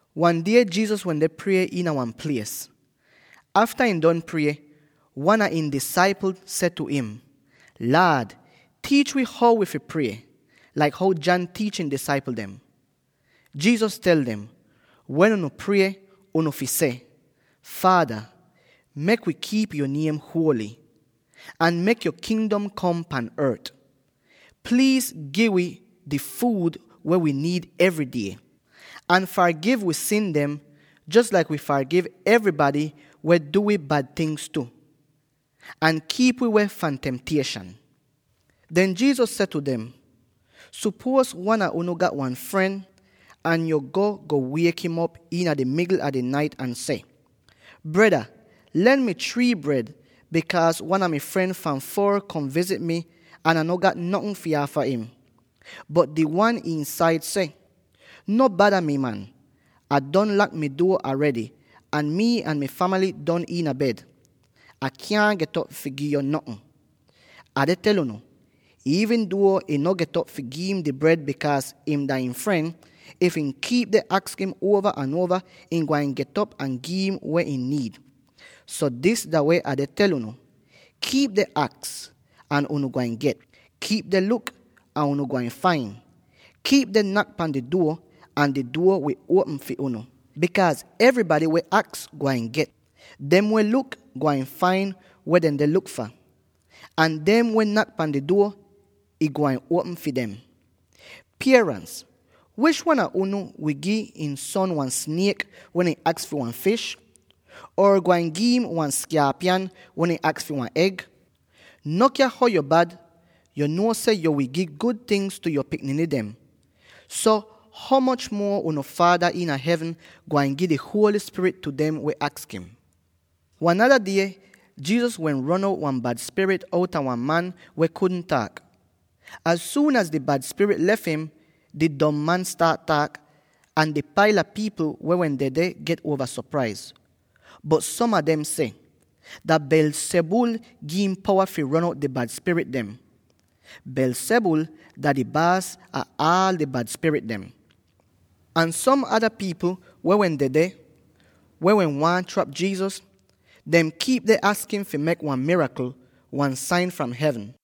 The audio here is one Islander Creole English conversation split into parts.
Wan die Jesus wende prie iina wan plies. Afta ihn don prie, wan a ihn disaipl seh tu im, “Laad, tiich wi how fi prie, laik how John tiich ihn disaipl dem.” Jesus tel dem, “Wen unu prie, unu fi seh: ‘Faada: Mek wi kiip yo niem huoly; ahn mek yo Kingdom kom pan ort. Pliiz gi wi di fuud weh wi niid evry die, ahn fargiv wi sin dem, jos laik wii fargiv evrybady weh du wi bad tingz tu. Ahn kiip wi weh fahn temtieshan.’” Den Jesus seh tu dem, “Supuoz wan a unu gat wan fren, ahn yo go, go wiek'im op iina di migl a di nait ahn seh, ‘Breda, len mi three bred, bikaaz wan a mai fren fahn foor kom vizit mi ahn Ah no gat notn fi aafa im.’ Bot di wan iinsaid seh, ‘No bada mi, man! Ah don lak mi duo aredy, ahn mii ahn mi famaly don iina bed. Ah kyaahn get'op fi gi'yo notn.’ “Ah deh tel unu: iivn duo ihn no get'op fi gi'im di bred bikaaz ihn dah ihn fren, if ihn kiip deh aks im uova ahn uova, ihn gwain get'op ahn gi'im weh ihn niid. So, dis dah weh Ah deh tel unu: kiip deh aks, ahn unu gwain get; kiip deh luk, ahn unu gwain fain; kiip deh nak pan di duo, ahn di duo wi uopm fi unu. Bikaaz evrybady weh aks, gwain get; dem weh luk, gwain fain weh dehn deh luk fah; ahn dem weh nak pan di duo, ih gwain uopm fi dem. “Pierans, wish wan a unu wi gi ihn son wan sniek, wen ihn aks fi wan fish? Or gwain gi'im wan skaapyan, wen ihn aks fi wan eg? No kya how yo bad, yo nuo seh yo wi gi gud tingz tu yo pikniny dem. So ho moch muo unu Faada iina hevn gwain gi di Holy Spirit tu dem weh aks im?” Wan nada die, Jesus wehn ron out wan bad spirit outa wan man weh kudn taak. Az suun az di bad spirit lef im, di dom man staat taak, ahn di paila pipl weh wehn dedeh get uova sopraiz. Bot som a dem seh, “Dah Beelzebul gi'im powa fi ron out di bad spirit dem. Beelzebul dah di baas ah aal di bad spirit dem.” Ahn som ada pipl weh wehn dedeh —weh wehn waahn trap Jesus— dem kiip deh aks im fi mek wan mirakl, wan sain fahn hevn.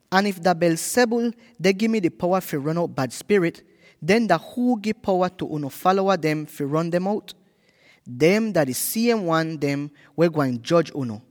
Ahn if dah Beelzebul deh gi mi di powa fi ron out bad spirit, den dah huu gi powa tu unu falowa dem fi ron dem out? Dem dah di siem wan dem weh gwain joj unu.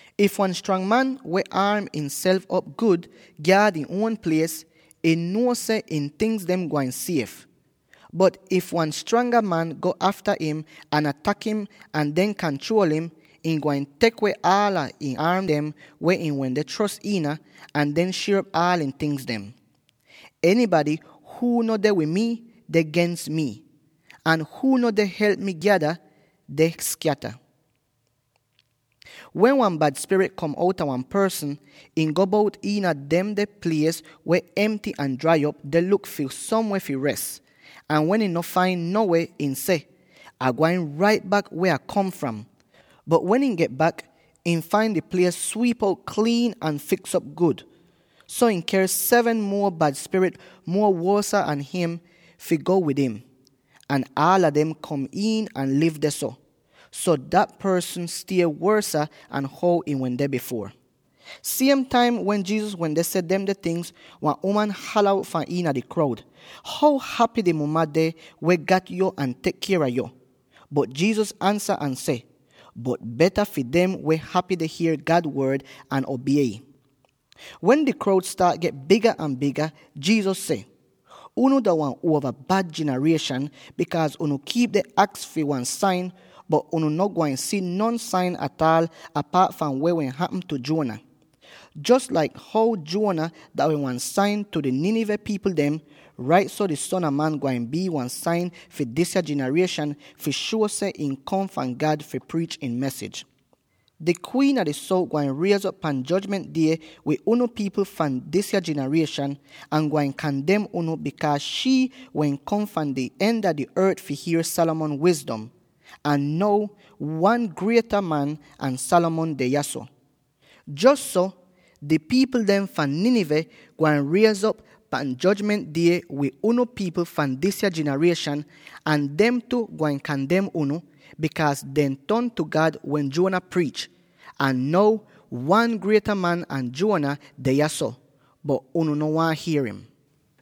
“If wan strang man weh aarm ihnself op gud gyaad ihn uon plies, ihn nuo seh ihn tingz gwain sief. Bot if wan stranga man go afta im ahn atak im ahn den kanchruol im, ihn gwain tek weh aala ihn aarm dem weh ihn wehn chros iina, ahn den shier op aal ihn tingz. “Enybady huu no deh wid mi, deh gens mi; ahn huu no deh help mi gyada, deh skyata.” “Wen wan bad spirit kom outa wan porsn, ihn go bout iina demde plies weh emty ahn drai op, deh luk fi somweh fi res. Ahn wen ihn no fain no weh, ihn seh, ‘Ah gwain rait bak weh Ah kom fram.’ Bot wen ihn get bak, ihn fain di plies swiip out kliin ahn fiks'op gud. So ihn ker seven muo bad spirit muo wosa an him, fi go wid im. Ahn aala dem kom iin ahn liv dehso. So dah porsn stie wosa an how ihn wende bifuor.” Siem taim wen Jesus wende seh demde tingz, wan uman hala out fahn iina di kroud, “How hapy di muma deh weh gat yo ahn tek kier a yo!” Bot Jesus ansa ahn seh, “Bot beta fi dem weh hapy deh hier God Wod, ahn obie ih!” Wen di kroud staat get biga ahn biga, Jesus seh, “Unu dah wan uova bad jinarieshan, bikaaz unu kiip deh aks fi wan sain, bot unu no gwain si non sain ataal apaat fahn weh wehn hapm tu Jonah. Jos laik how Jonah dah wehn wan sain tu di Nineveh pipl dem, rait so di Son a Man gwain bii wan sain fi disya jinarieshan fi shuo seh ihn kom fahn God fi priich ihn mesij. Di Kwiin a di Sout gwain riez'op pan Jojment Die wid unu pipl fahn disya jinarieshan ahn gwain kandem unu, bikaaz shii wehn kom fahn di en a di ort fi hier Solomon wizdom. Ahn now, wan grieta man an Solomon deh yahso. Jos so, di pipl dem fahn Nineveh gwain riez'op pan Jojment Die wid unu pipl fahn disya jinarieshan ahn dem tu gwain kandem unu, bikaaz dehn ton tu God wen Jonah priich. Ahn now, wan grieta man an Jonah deh yahso, bot unu no waahn hier im!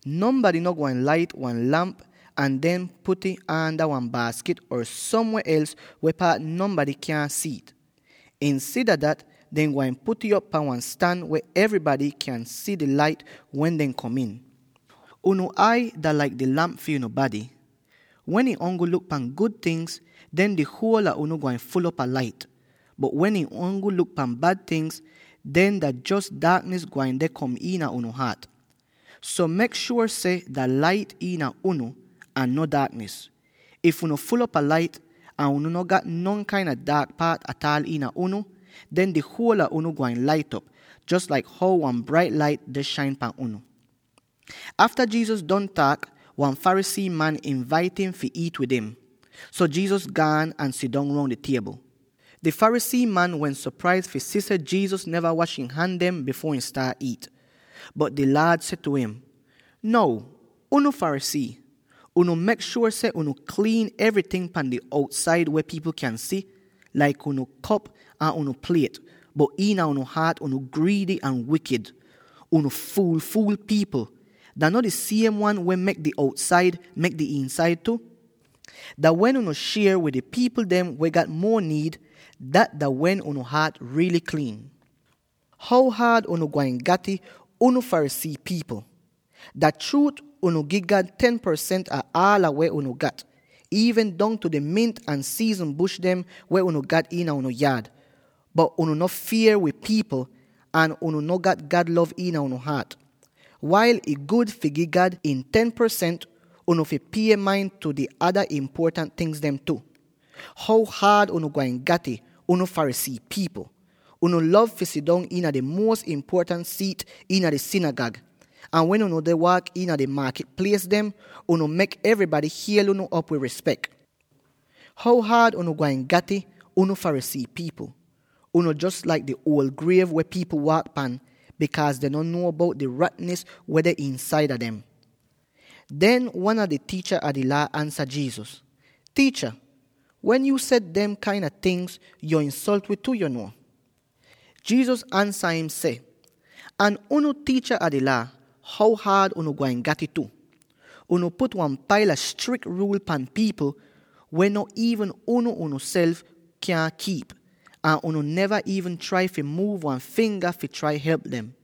“Nonbady no gwain lait wan lamp ahn den put'ih aanda wan baaskit or somweh els weh paat nonbady kyaahn si'ih. Insida dat dehn gwain put'ih op pan wan stan weh evrybady kyan si di lait wen dehn kom iin. Unu ai dah laik di lamp fi unu bady. Wen ih ongl luk pan gud tingz, den di huol a unu gwain ful'op a lait; bot wen ih ongl luk pahn bad tingz, den dah jos daaknis gwain deh kom iina unu haat. So mek shuor seh dah lait iina unu, ahn no daaknis. If unu ful'op a lait, ahn unu no gat non kain a daak spat ataal iina unu, den di huol a unu gwain lait'op, jos laik how wan brait lait deh shain pan unu.” Afta Jesus don taak, wan Pharisee man invait im fi iit wid im. So Jesus gaan ahn sidong roun di tiebl. Di Pharisee man wehn sopraiz fi si seh Jesus neva wash ihn han dem bifuor ihn staat iit. Bot di Laad seh tu im, “Now, unu Pharisee! Unu mek shuor seh unu kliin evryting pan di outsaid weh pipl kyan si, laik unu kop ahn unu pliet, bot iina unu haat unu griidy ahn wikid! Unu fuul-fuul pipl! Dah no di siem wan weh mek di outsaid mek di iinsaid tu? Dah wen unu shier wid di pipl dem weh gat muo niid, dat dah wen unu haat riily kliin. “How haad unu gwain gat'ih, unu Pharisee pipl! Dah chruut unu gi God ten porsent ah aal weh unu gat, iivn dongtu di mint ahn di siiznin bush dem weh unu gat iina unu yaad, bot unu no fier wid pipl ahn unu no gat God lov iina unu haat. Wail ih gud fi gi God ihn ten porsent, unu fi pie main tu di ada impuotant tingz tu. “How haad unu gwain gat'ih, unu Pharisee pipl! Unu lov fi sidong iina di muos impuotant siit iina di sinigag, ahn wen unu deh waak iina di maakit plies dem, unu mek evrybady hiel unu op wid rispek. “How haad unu gwain gat'ih, unu Pharisee pipl! Unu jos laik di uol griev weh pipl waak pan, bikaaz dehn no nuo bout di ratnis weh deh iinsaida dem.” Den wan a di tiicha a di Laa ansa Jesus, “Tiicha, wen yuu seh dem kain a tingz, yo insolt wi tu, yo nuo.” Jesus ansa im ahn seh, “Ahn unu tiicha a di Laa, how haad unu gwain gat'ih tu! Unu put wan paila strik ruul pan pipl, weh nat iivn unu uonself kyan kiip, ahn unu neva iivn trai fi muuv wan finga fi trai help dem.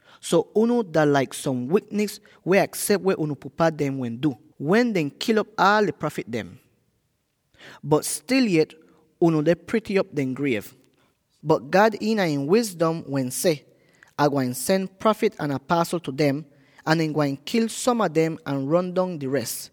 So unu dah laik som wiknis weh aksep weh unu pupa dem wehn du, wen dehn kil'op aal di prafit dem. Bot stil yet unu deh prity op dehn griev. Bot God iina ihn wizdom wehn seh, ‘Ah gwain sen prafit ahn apasl tu dem, ahn dehn gwain kil som a dem ahn ron dong di res.’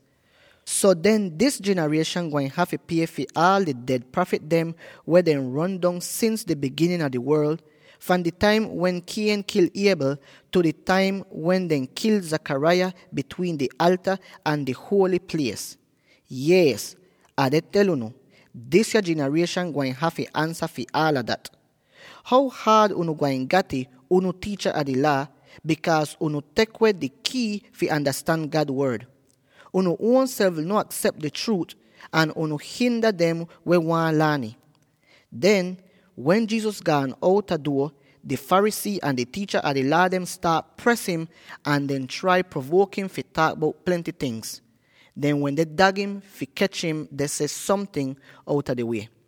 So den dis jinarieshan gwain hafy pie fi aal di ded prafit dem weh dehn ron dong sins di biginin a di worl, fahn di taim wen Cain kil Abel tu di taim wen dehn kil Zachariah bitwiin di alta ahn di huoly plies. Yees, Ah deh tel unu: disya jinarieshan gwain hafy ansa fi aala dat. “How haad unu gwain gat'ih, unu tiicha a di Laa, bikaaz unu tek weh di kii fi andastan God Wod. Unu uonself no aksep di chruut, ahn unu hinda dem weh waahn laan ih.” Den, wen Jesus gaan outa duo, di Pharisee ahn di tiicha a di Laa dehn staat pres im ahn deh trai provuok im fi taak bout plenty ting. Dehn wende dag im fi kech im deh seh somting outa di wie.